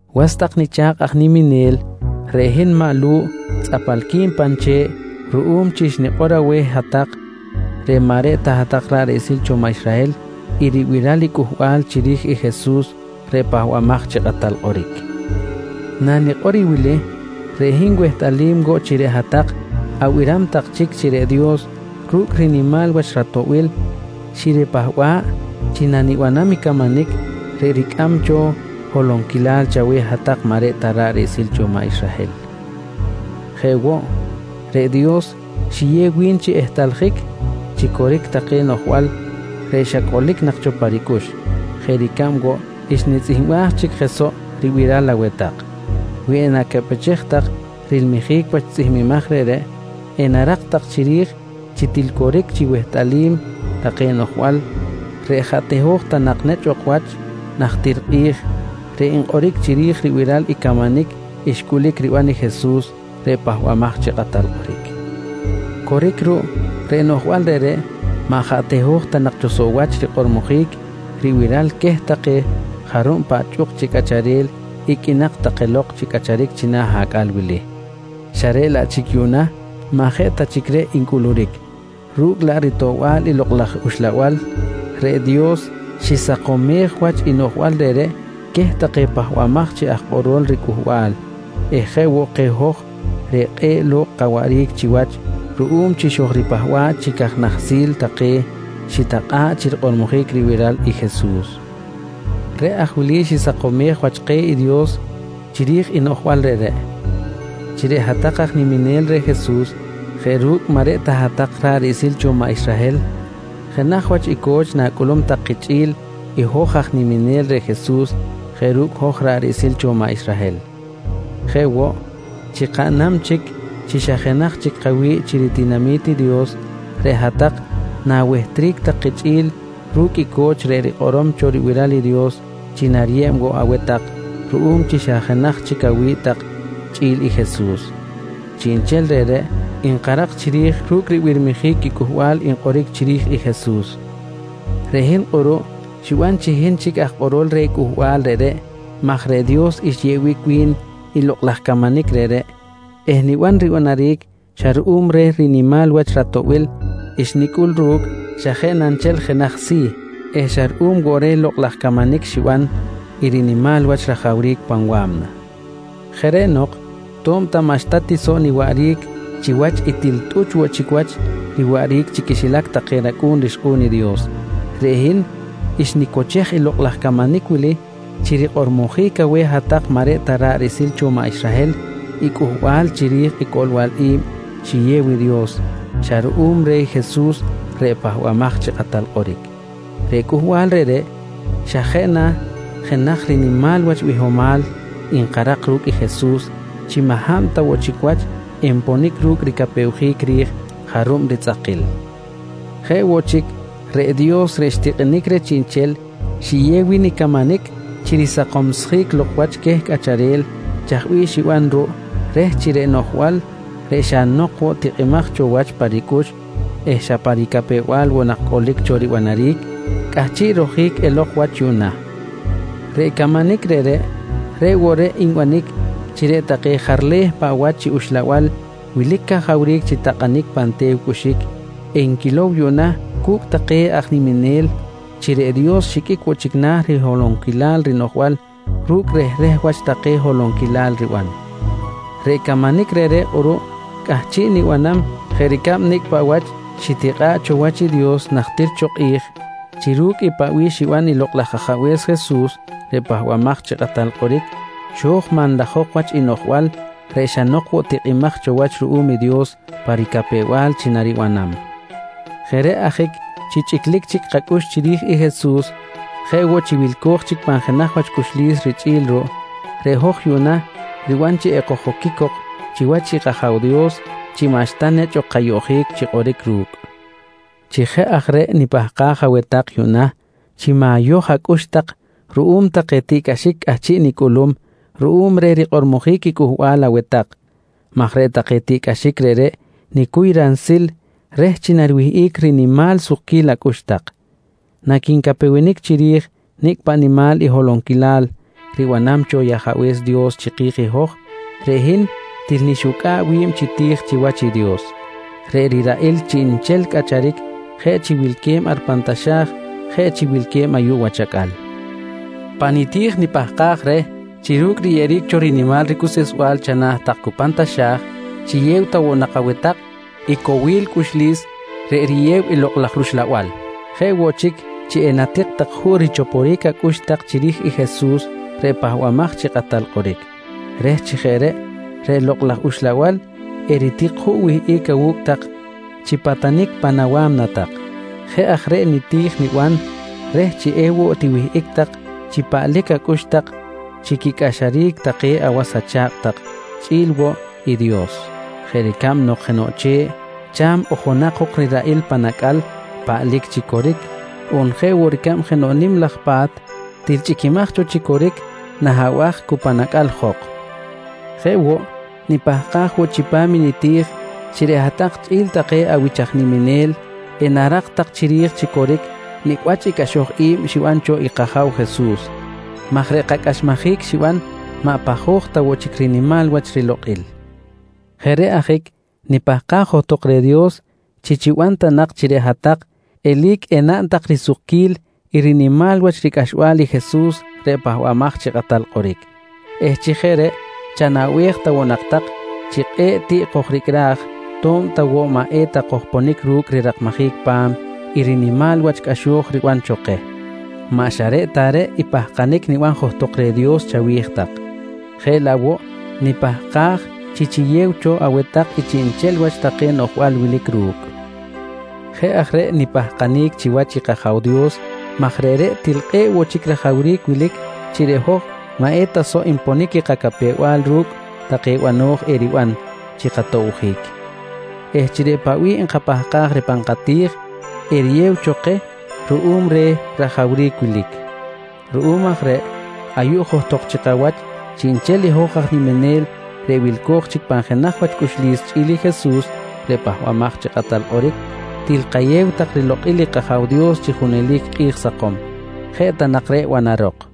Was tak nicha̱kꞌ aj niminel, reꞌ hin maꞌ Lu̱ꞌ tzꞌapalqui̱n pan che̱ꞌ ruꞌum chi xnikꞌor aweh i hat-tak reꞌ maꞌ reꞌ ta hat-tak ra̱ꞌ riꞌsil cho maꞌ Israhel i ribiral i cꞌuhbal chiri̱j i Jesus reꞌ Pahbamaj chi Kꞌatal Kꞌoric. Nanikꞌor i wili, reꞌ hin wehtꞌalim woꞌ chi reꞌ hat-tak abiram tak chic chi reꞌ Dios ru̱cꞌ rinimal wach ratoꞌbil xiripahba̱ꞌ chi nanibanam i camanic reꞌ ricꞌam cho holonquilal chaweh hat-tak maꞌ reꞌ ta ra̱ꞌ riꞌsil cho i maꞌ Israhel. Jeꞌ woꞌ, reꞌ Dios xiyew wi̱n chi ehtꞌaljic chi coric take noꞌjbal reꞌ xa cꞌolic nak cho pa ricꞌux jeꞌ ricab woꞌ xnitzꞌihmbaj chic je soꞌ ribiral aweh tak. Wi enacaꞌpechej tak rilmijic wach tzꞌihmbimaj reꞌreꞌ, enarak tak chiri̱j chi til coric chi wehtꞌalim take noꞌjbal reꞌ jaꞌ teho̱j ta nak nechꞌ ok wach najtir kꞌi̱j, reꞌ nkꞌoric chiri̱j ribiral i camanic xcꞌulic riban i Jesus reꞌ Pahbamaj chi Kꞌatal Kꞌoric. Coric ruꞌ, reꞌ noꞌjbal reꞌreꞌ maꞌ jaꞌ teho̱j ta nak cho soꞌ wach rikꞌormojic ribiral queh take jarub paꞌ chꞌuk chi cꞌacharel iqꞌuinak take lok chi cꞌacharic china̱ acꞌal wili xa reꞌ laꞌ chic yuꞌna maꞌ jeꞌ ta chic reꞌ ncꞌuluric, ru̱cꞌ laꞌ ritoꞌbal i Lokꞌ laj Uxlabal reꞌ Dios xisakomej wach i noꞌjbal reꞌreꞌ queh take pahbamaj chi aj kꞌorol riCꞌuhbal eh jeꞌ woꞌ keh hoj reꞌ kꞌe̱ꞌ lok kawaꞌric chiwach ruꞌum chi xojripahba̱ꞌ chi caj nahsil take xitakꞌa̱ꞌ chi rikꞌormojic ribiral i Jesus. Reꞌ aj wili i xisakomej wach keh i Dios chiri̱j i noꞌjbal reꞌreꞌ: Chi reꞌ hat-tak aj niminel reh Jesus jeꞌ ru̱cꞌ maꞌ reꞌ ta hat-tak ra̱ꞌ riꞌsil cho maꞌ Israhel jenaj wach i co̱ch na̱cꞌulum tak kichꞌi̱l i hoj aj niminel reh Jesus jeꞌ ru̱cꞌ hoj ra̱ꞌ riꞌsil cho maꞌ Israhel. Jeꞌ woꞌ, chi kaꞌnam chic chi xa jenaj chic kawi̱ꞌ chi ritinami̱t i Dios, reꞌ hat-tak na̱wehtric tak kichꞌi̱l ru̱cꞌ i co̱ch reꞌ rikꞌorom cho ribiral i Dios chi nariyeb woꞌ aweh tak ruꞌum chi xa jenaj chic awi̱ꞌ tak chꞌi̱l i Jesus. Chiꞌnchel reꞌreꞌ nkarak chiri̱j ru̱cꞌ ribirmijic i cꞌuhbal nkꞌoric chiri̱j i Jesus. Reꞌ hin kꞌuruꞌ xiban chi hin chic aj kꞌorol reh cꞌuhbal reꞌreꞌ maj reꞌ Dios xyeꞌbic wi̱n i lokꞌ laj camanic reꞌreꞌ eh niban ribanaric xa ruꞌum reh rinimal wach ratoꞌbil xnicꞌul ru̱cꞌ xa jeꞌ na nchel jenaj si̱ eh xa ruꞌum woꞌ reh lokꞌ laj camanic xiban i rinimal wach rajawric pan wa̱mna. Jeꞌ reꞌ nok tob ta maꞌxta ti soꞌ niwaꞌric chiwach i til tꞌuch woꞌ chic wach riwaꞌric chi quixilac take racꞌu̱n rixkꞌu̱n i Dios, reꞌ hin xnicochej i lokꞌ laj camanic wili chi rikꞌormojic aweh hat-tak maꞌ reꞌ ta ra̱ꞌ riꞌsil cho maꞌ Israhel i cꞌuhbal chiri̱j i coꞌlbal i̱b xiyew i Dios xa ruꞌum reh i Jesus reꞌ Pahbamaj chi Kꞌatal Kꞌoric. Reꞌ cꞌuhbal reꞌreꞌ xa jeꞌ na jenaj rinimal wach bihomal nkarak ru̱cꞌ i Jesus chi maꞌ hab ta woꞌ chic wach enponic ru̱cꞌ ricapewjic ri̱j jarub ritzꞌakil. Jeꞌ woꞌ chic reꞌ Dios reꞌ xtikꞌinic reh chiꞌnchel, xiyew wi̱n i camanic chi risakomsjic lok wach queh cꞌacharel chaj bih xiban ruꞌ reh chi reꞌ noꞌjbal reꞌ xa nok woꞌ tikꞌimaj cho wach pa ricꞌux eh xa pa ricapew-bal woꞌ nak cꞌolic cho ribanaric, cꞌahchiꞌ rojic elok wach yuꞌna. Reꞌ camanic reꞌreꞌ, reꞌ woꞌ reꞌ nbanic chi reꞌ take jarleh paꞌ wach chi uxlabal wilic cajawric chi takꞌanic pan te̱w cꞌuxic enquilow yuꞌna cu̱cꞌ take aj niminel chi reꞌ Dios xiqꞌuic woꞌ chic na̱ riholonquilal rinoꞌjbal ru̱cꞌ rehreh wach take holonquilal riban. Reꞌ camanic reꞌreꞌ kꞌuruꞌ cꞌahchiꞌ nibanam jeꞌ ricab nicꞌ paꞌ wach xitikꞌa̱ꞌ cho wach i Dios najtir cho kꞌi̱j chi ru̱cꞌ i paꞌ bih xiban i Lokꞌ laj Ajabe̱s Jesus reꞌ Pahbamaj chi Kꞌatal Kꞌoric, xo̱j manlajok wach i noꞌjbal reꞌ xa nok woꞌ tikꞌimaj cho wach ruꞌum Dios pa ricapew-bal chi naribanam. Jeꞌ reꞌ ajic chi chꞌiclic chic kacꞌux chiri̱j i Jesus jeꞌ woꞌ chi wilco̱j chic pan jenaj wach cꞌuxlis richꞌi̱l ruꞌ, reꞌ hoj yuꞌna riban chi ekoj-oquic cok chiwach i kAja̱w Dios chi maꞌxta nechꞌ ok kayoꞌjic chi kꞌoric ru̱cꞌ. Chi jeꞌ aj reꞌ nipahkaj aweh tak yuꞌna chi ma̱yoj acꞌux tak ruꞌum take tiꞌcꞌaxic cꞌahchiꞌ nicꞌulum ruꞌum reh rikꞌormojic i cꞌuhbal aweh tak maj reꞌ take tiꞌcꞌaxic reꞌreꞌ nicuy ransil reh chi nariwihꞌic rinimal sukquil acꞌux tak. Naquincapewenic chiri̱j nicꞌ paꞌ nimal holonquilal ribanam cho i Ajabe̱s Dios chiki̱j i hoj, reꞌ hin til nixucꞌa̱ꞌ wi̱b chi ti̱j chiwach i Dios reꞌ riraꞌil chiꞌnchel cꞌacharic jeꞌ chi wilque̱b ar pan taxa̱j, jeꞌ chi wilque̱b ayuꞌ wach acꞌal. Pan niti̱j nipahkaj reh chi ru̱cꞌ riyeꞌeric cho rinimal ricuseꞌsbal chana̱ tak cu pan taxa̱j, chiyew ta nak aweh tak i cowil cꞌuxlis reꞌ riyew i Lokꞌ laj rUxlabal. Jeꞌ woꞌ chic, chi enatik tak juꞌ richoporic acꞌux tak chiri̱j i Jesus reꞌ Pahbamaj chi Kꞌatal Kꞌoric reh chi jeꞌ reꞌ, reꞌ Lokꞌ laj Uxlabal eritik juꞌ wihꞌic awu̱cꞌ tak chi patanic pan awa̱mna tak. Jeꞌ aj reꞌ niti̱j niban reh chi ewoꞌ tiwihꞌic tak chi paꞌlic chic acꞌux tak chi quicꞌaxaric take awas acha̱kꞌ tak chꞌi̱l woꞌ i Dios jeꞌ ricab nok jenoꞌ che̱ꞌ cha̱m ojonak jok riraꞌil pan acꞌal paꞌlic chi coric, on jeꞌ woꞌ ricab nok jenoꞌ nim laj pa̱t til chꞌiquimaj cho chi coric nah abaj cu pan acꞌal jok. Jeꞌ woꞌ, nipahkaj woꞌ chipam i niti̱j chi reꞌ hat-tak chꞌi̱l take awich aj niminel enarak tak chiri̱j chi coric nicꞌ wach i cꞌaxoj i̱b xiban cho i kAja̱w Jesus maj reꞌ kacꞌaxmajic xiban maꞌ pajoj ta woꞌ chic rinimal wach rilokꞌil. Jeꞌ reꞌ ajic nipahkaj woꞌ johtok reh Dios chi chiban ta nak chi reꞌ hat-tak eli̱c enaꞌn tak risukquil i rinimal wach ricꞌaxbal i Jesus reꞌ Pahbamaj chi Kꞌatal Kꞌoric eh chi jeꞌ reꞌ chanaꞌbej ta woꞌ nak tak chi kꞌe̱ꞌ tiꞌ kojricꞌraj to̱b ta woꞌ maꞌ eta kojponic ru̱cꞌ rirakmajic pa̱m i rinimal wach cꞌaxo̱j riban cho keh. Maꞌ xa reꞌ ta reꞌ i pahkanic niban johtok reh i Dios chawi̱j tak jeꞌ laꞌ woꞌ nipahkaj chi chiyew cho aweh tak i chiꞌnchel wach take noꞌjbal wilic ru̱cꞌ. Jeꞌ aj reꞌ nipahkanic chiwach i kAja̱w Dios maj reꞌreꞌ til kꞌe̱ꞌ woꞌ chic rajawric wilic chi reꞌ hoj maꞌ eta soꞌ nponic i kacapew-bal ru̱cꞌ take bano̱j eriban chi katobjic eh chi reꞌ paꞌ bih nkapahkaj reh pan kati̱j eriyew cho keh ruꞌum reh rajawric wilic. Ruꞌum aj reꞌ ayuꞌ johtok chi kawach chiꞌnchel i hoj aj niminel reꞌ wilco̱j chic pan jenaj wach cꞌuxlis chꞌi̱l i Jesus reꞌ Pahbamaj chi Kꞌatal Kꞌoric, til kayew tak rilokꞌil i kAja̱w Dios chi junelic kꞌi̱j sakom. Jeꞌ ta nak reꞌ banarok.